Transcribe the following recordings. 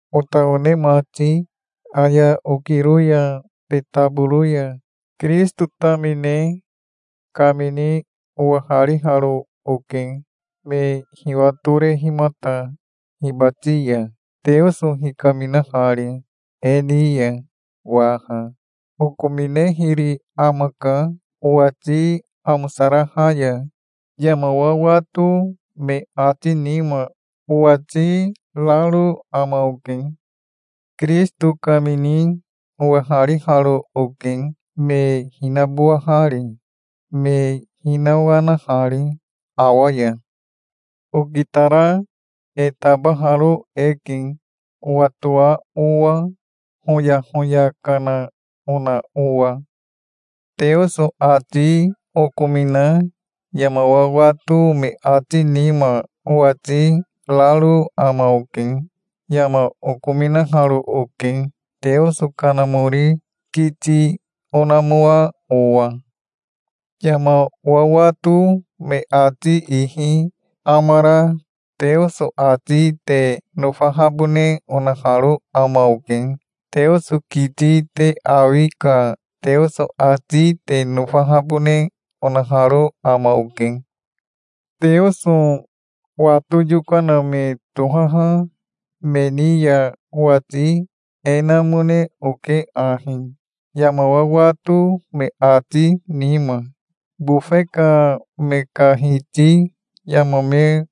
Ota one mati, aya okiro ya te taboro ya Kirisito tamine kamini owahariharo oke, me hiwatorehimata hibati ya, Teoso hikaminahari e ni ya waha. Okominehiri amaka owati amosaraha ya. Yama wawato me ati nima owati raro ama oke. Kirisito kamini owahariharo oke, me hinabowahari, me hinawanahari awa ya. Okitara e tabaharo eke, owatoa owa, hoyahoya kana ona owa. Teoso ati okomina yama wawato me ati nima owati raro ama oke. Yama okominaharo oke, Teoso Kanamori kiti onamoa owa. Yama wawato me ati ihi amara Teoso ati te nofahabone onaharo ama oke. Teoso kiti te awi ka Teoso ati te nofahabone onaharo ama oke. Teoso wato yokana me tohaha me ni ya owati e namone oke ahi yama wawato me ati nima. Bofe ka me ka hiti yama me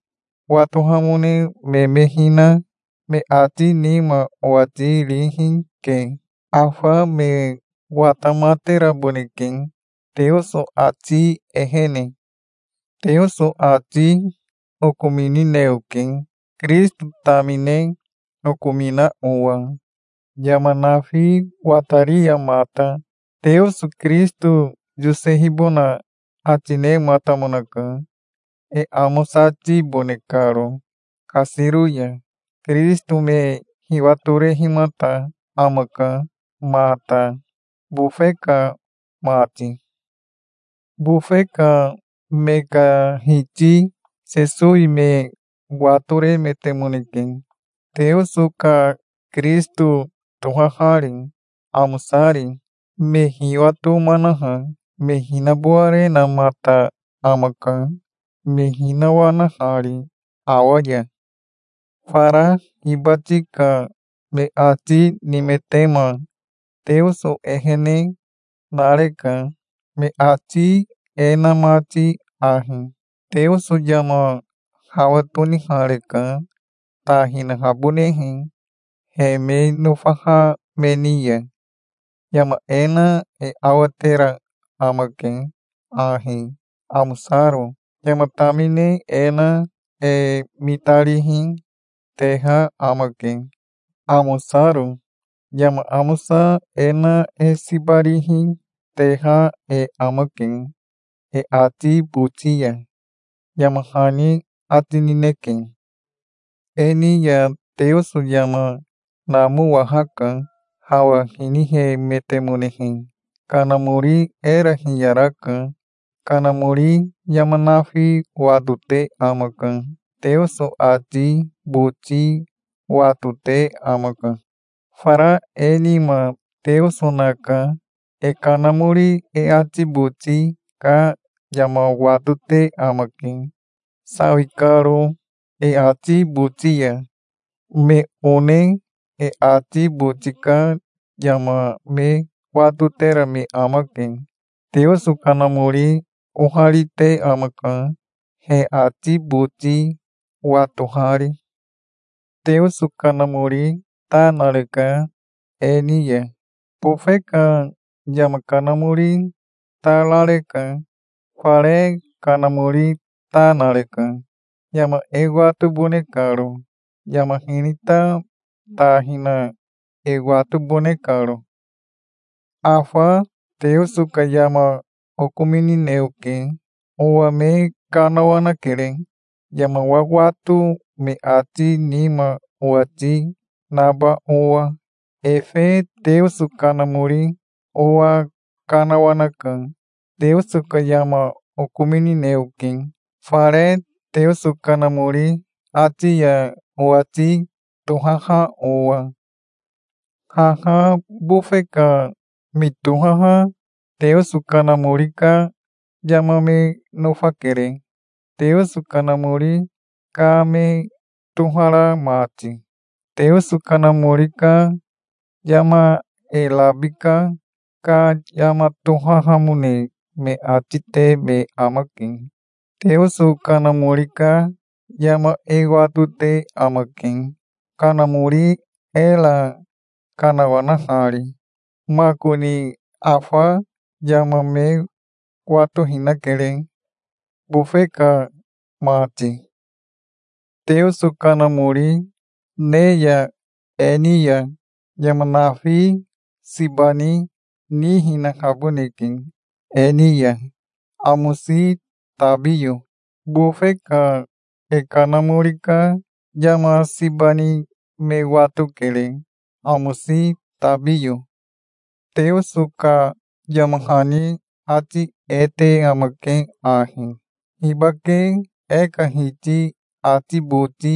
watohamone me me hina me ati nima owati rihi ke. Afa me watamateraboneke Teoso ati ehene. Teoso ati okominine oke, Kirisito tamine okomina owa. Yama nafi watari ya mata Teoso Kirisito yosehibona ati nematamonaka, e amosatibone karo kasiro ya. Kirisito me hiwatorehimata amaka mata, bofe ka mati. Bofe ka me ka hiti Sesowi me watoremetemoneke, Teoso ka Kirisito tohahari, amosari. Me hiwatomanaha, me hinabowarenamata amaka, me hinawanahari awa ya. Fara hibati ka me ati nimetema Teoso ehene nareka, me ati e na mati ahi: "Teoso yama hawa tonihareka, ta hinahabonehe he me nofaha me ni ya. Yama e na e awatera amake ahi, amosaro. Yama tamine e na e mitarihi, teha amake, amosaro. Yama amosa e na e siba rihi teha e amake e ati boti ya", yama hani ati nineke. E ni ya Teoso yama namowahaka, hawa hinihemetemonehe. Kanamori era hiyaraka. Kanamori yama nafi watote amaka. Teoso ati boti watote amaka. Fara e nima Teoso naka. E kanamori e ati boti ka yama watote amake, sawi karo e boti ya. Me one e ati boti ka yama me watotera me amake. Teoso Kanamori oharite amaka, he ati boti watohari. Teoso Kanamori ta nareka e ni ya. Bofe ka yama kanamori ta rareka. Fare Kanamori ta nareka, yama e watobone karo, yama hinita ta hina e watobone karo. Afa Teoso ka yama okominine oke. Owa me kanawanakere, yama wawato me ati nima owati naba owa. Efe Teoso Kanamori owa kanawanaka. Teoso ka yama okominine oke, fare Teoso Kanamori ati ya owati tohaha owa. Haha bofe ka me tohaha Teoso Kanamori ka yama me nofakere, Teoso Kanamori ka me tohara mati. Teoso Kanamori ka yama e rabika ka yama tohahamone me ati te me amake. Teoso Kanamori ka yama e watote amake, Kanamori era kanawanahari. Makoni afa yama me watohinakere, bofe ka mati. Teoso Kanamori ne ya e ni ya yama nafi siba ni nihinahaboneke e ni ya, amosi tabiyo. Bofe ka e kanamori ka yama siba ni me watokere, amosi tabiyo. Teoso ka yama hani ati e te amake ahi: "Hibake e ka Hiti ati boti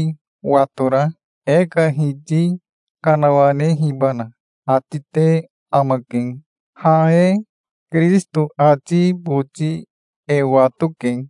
watora, e ka Hiti kanawanehibana?" ati te amake. Ha e Kirisito ati boti e watoke.